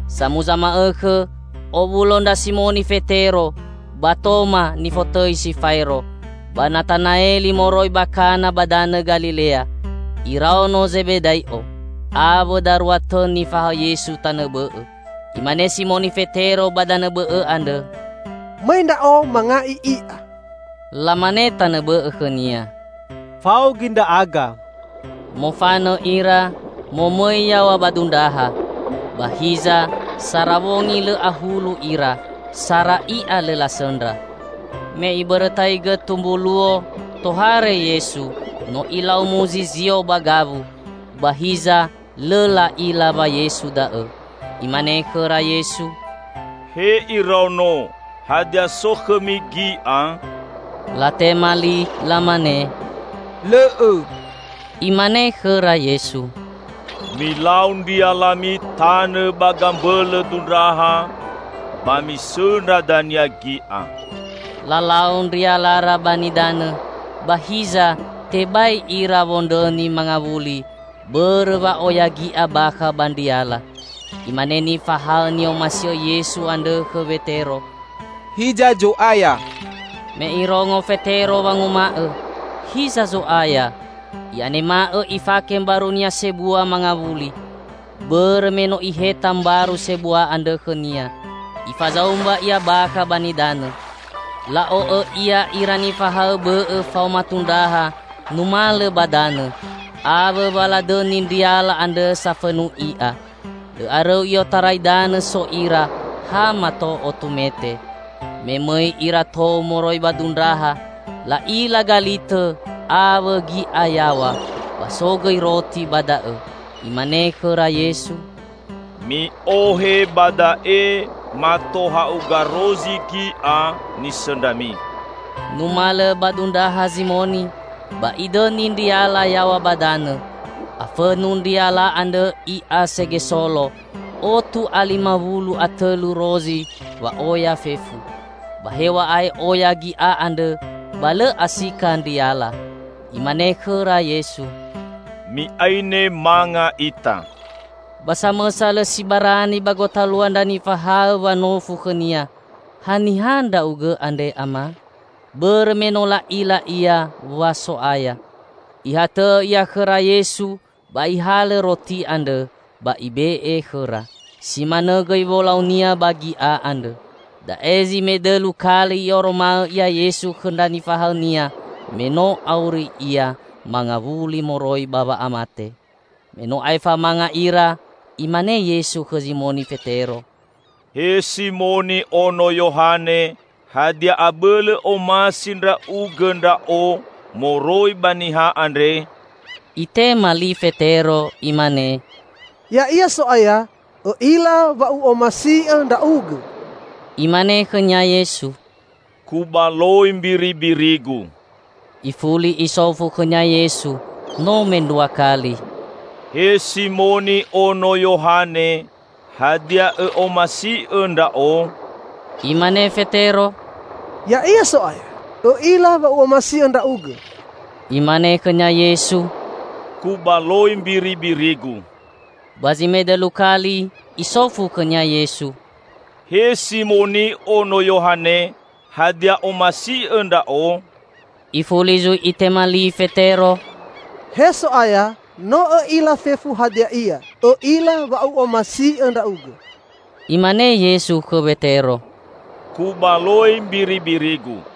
Samuza ma'õkhõ owulo ndra Simoni Fetero ba Toma nifotõi si Faero, ba Natanaeli moroi ba Kana ba danõ Galilea, iraono Zebedai'o, awõ darua tõ nifahaõ Yesu tanõ bõ'õ. Imane Simoni Fetero ba danõ bõ'õ andrõ, "Mõi ndra'o manga'i i'a." Lamane tanõ bõ'õ khõnia, "Fao gõi ndra'aga." Mofanõ ira, momõi yaw̃a ba dundraha. Ba hiza sara wongi lõ ahulu ira, sara i'a lõ lasõndra. Me ibõrõtaigõ tumbu luo, tohare Yesu, no Ilau muzizio ba gawu; ba hiza lõ la'ila wa Yesu da'õ. Imane khõra Yesu, "He iraono, hadia so khõmi gi'a?" Latema li, lamane, "Lõ'õ." Imane khõra Yesu, "Milau ndrialami tanõ ba gambõlõ dundraha, ba misõndra dania gi'a." Lalau ndrialara ba nidanõ, ba hiza tebai ira wondrõni mangawuli bõrõ wa'oya gi'a bakha ba ndriala. Imane nifahaõ ni'omasi'õ Yesu andrõ khõ Wetero, "Hiza Zo'aya!" Me irongo Fetero wanguma'õ, "Hiza Zo'aya!", i'anema'õ ifake mbarunia sebua mangawuli (bõrõ me no iheta mbaru sebua andrõ khõnia) ifazaumba ia bakha ba nidanõ. La'o'õ ia ira nifahaõ bõ'õ faoma tundraha numalõ ba danõ, awõ wa ladõni ndriala andrõ safõnu i'a. Lõ arõu i'otarai danõ so ira, ha mato otu mete. Me mõi ira tou moroi ba dundraha, la'ila galitõ awõ gi'a yaw̃a; ba so gõi roti ba da'õ. Imane khõra Yesu, "Mi'ohe ba da'e mato ha'uga rozi gi'a nisõndrami." Numalõ ba dundraha Zimoni, ba idõni ndriala yaw̃a ba danõ. Afõnu ndriala andrõ i'a segesolo; otu a lima wulu a tõlu rozi wa'oya fefu. Ba hew̃a'ae oya gi'a andrõ, ba lõ asika ndriala. Imane khõra Yesu, "Mi'aine manga ita." Ba samõsa lõ si barani ba gotalua ndra nifahaõ wanofu khõ-Nia, "Haniha Ndra'ugõ andre, Ama?" Bõrõ me no la'ila Ia wa So'aya. Ihatõ'õ Ia khõra Yesu ba Ihalõ roti andrõ, ba Ibe'e khõra. Si manõ gõi wolau-Nia ba gi'a andrõ. Da'e zi medõlu kali I'oroma'õ Ia Yesu khõ ndra nifahaõ-Nia me no auri Ia mangawuli moroi ba wa'amate. Me no aefa manga ira, Imane Yesu khõ Zimoni Fetero, "He Simoni ono Yohane, hadia abõlõ omasi ndra'ugõ Ndra'o moroi ba niha andre?" Itema li Fetero imane, "Ya'ia, So'aya. Õ'ila wa u'omasi'õ Ndra'ugõ." Imane khõnia Yesu, "Kubaloi mbiribiri-Gu." Ifuli Isofu khõnia Yesu no mendrua kali, "He Simoni ono Yohane, hadia õ'omasi'õ Ndra'o?" Imane Fetero, "Ya'ia So'aya. Õ'ila wa u'omasi'õ Ndra'ugõ." Imane khõnia Yesu, "Kubaloi mbiribiri-Gu." Ba zi medõlu kali Isofu khõnia Yesu, "He Simoni ono Yohane, hadia omasi'õ Ndra'o?" Ifuli zui itema li Fetero, "He So'aya, no Õ'ila fefu hadia ia. Õ'ila wa u'omasi'õ Ndra'ugõ!" Imane Yesu khõ Wetero, "Kubaloi mbiribiri-Gu.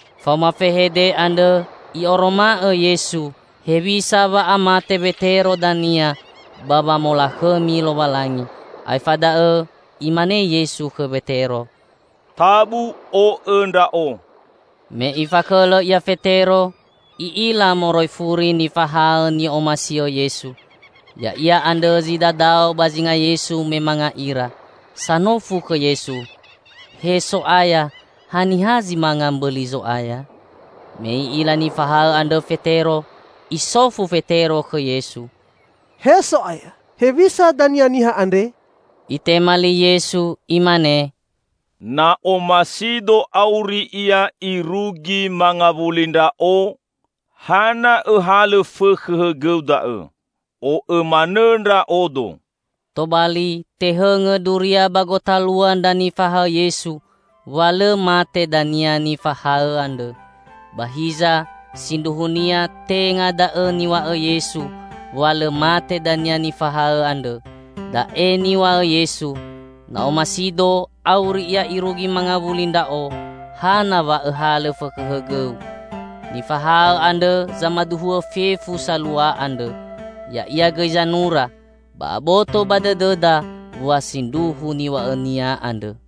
(Faoma fehede andrõ I'oroma'õ Yesu hewisa wa'amate Wetero dania ba wamolakhõmi Lowalangi.) Aefa da'õ Imane Yesu khõ Wetero, "Tabu o'õ Ndra'o!" Me ifakhõlõ ia Fetero, i'ila moroi furi nifahaõ ni'omasi'õ Yesu. (Ya'ia andrõ zi dadao ba zinga Yesu me manga ira, sanofu khõ Yesu, "He So'aya, haniha zi manga mbõli Zo'aya?") Me i'ila nifahaõ andrõ Fetero, isofu Fetero khõ Yesu, "He So'aya, hewisa dania niha andre?" Itema li Yesu Imane, "Na omasido auri ia irugi mangawuli Ndra'o, hana õhalõ fõkhõ hõgõu da'õ. O'õ manõ Ndra'odo!" Tobali tehõngõ duria ba gotalua ndra nifahaõ Yesu wa lõ mate dania nifahaõ andrõ. Ba hiza sindruhunia tenga da'õ niw̃a'õ Yesu wa lõ mate dania nifahaõ andrõ; Da'e niw̃a'õ Yesu: "Na omasido auri ia irugi mangawuli Ndra'o, hana wa õhalõ fõkhõ hõgõu!" Nifahaõ andrõ zamaduhu'õ fefu salua andrõ. Ya'ia gõi zanura. Ba aboto ba dõdõda wa sindruhu niw̃a'õnia andrõ.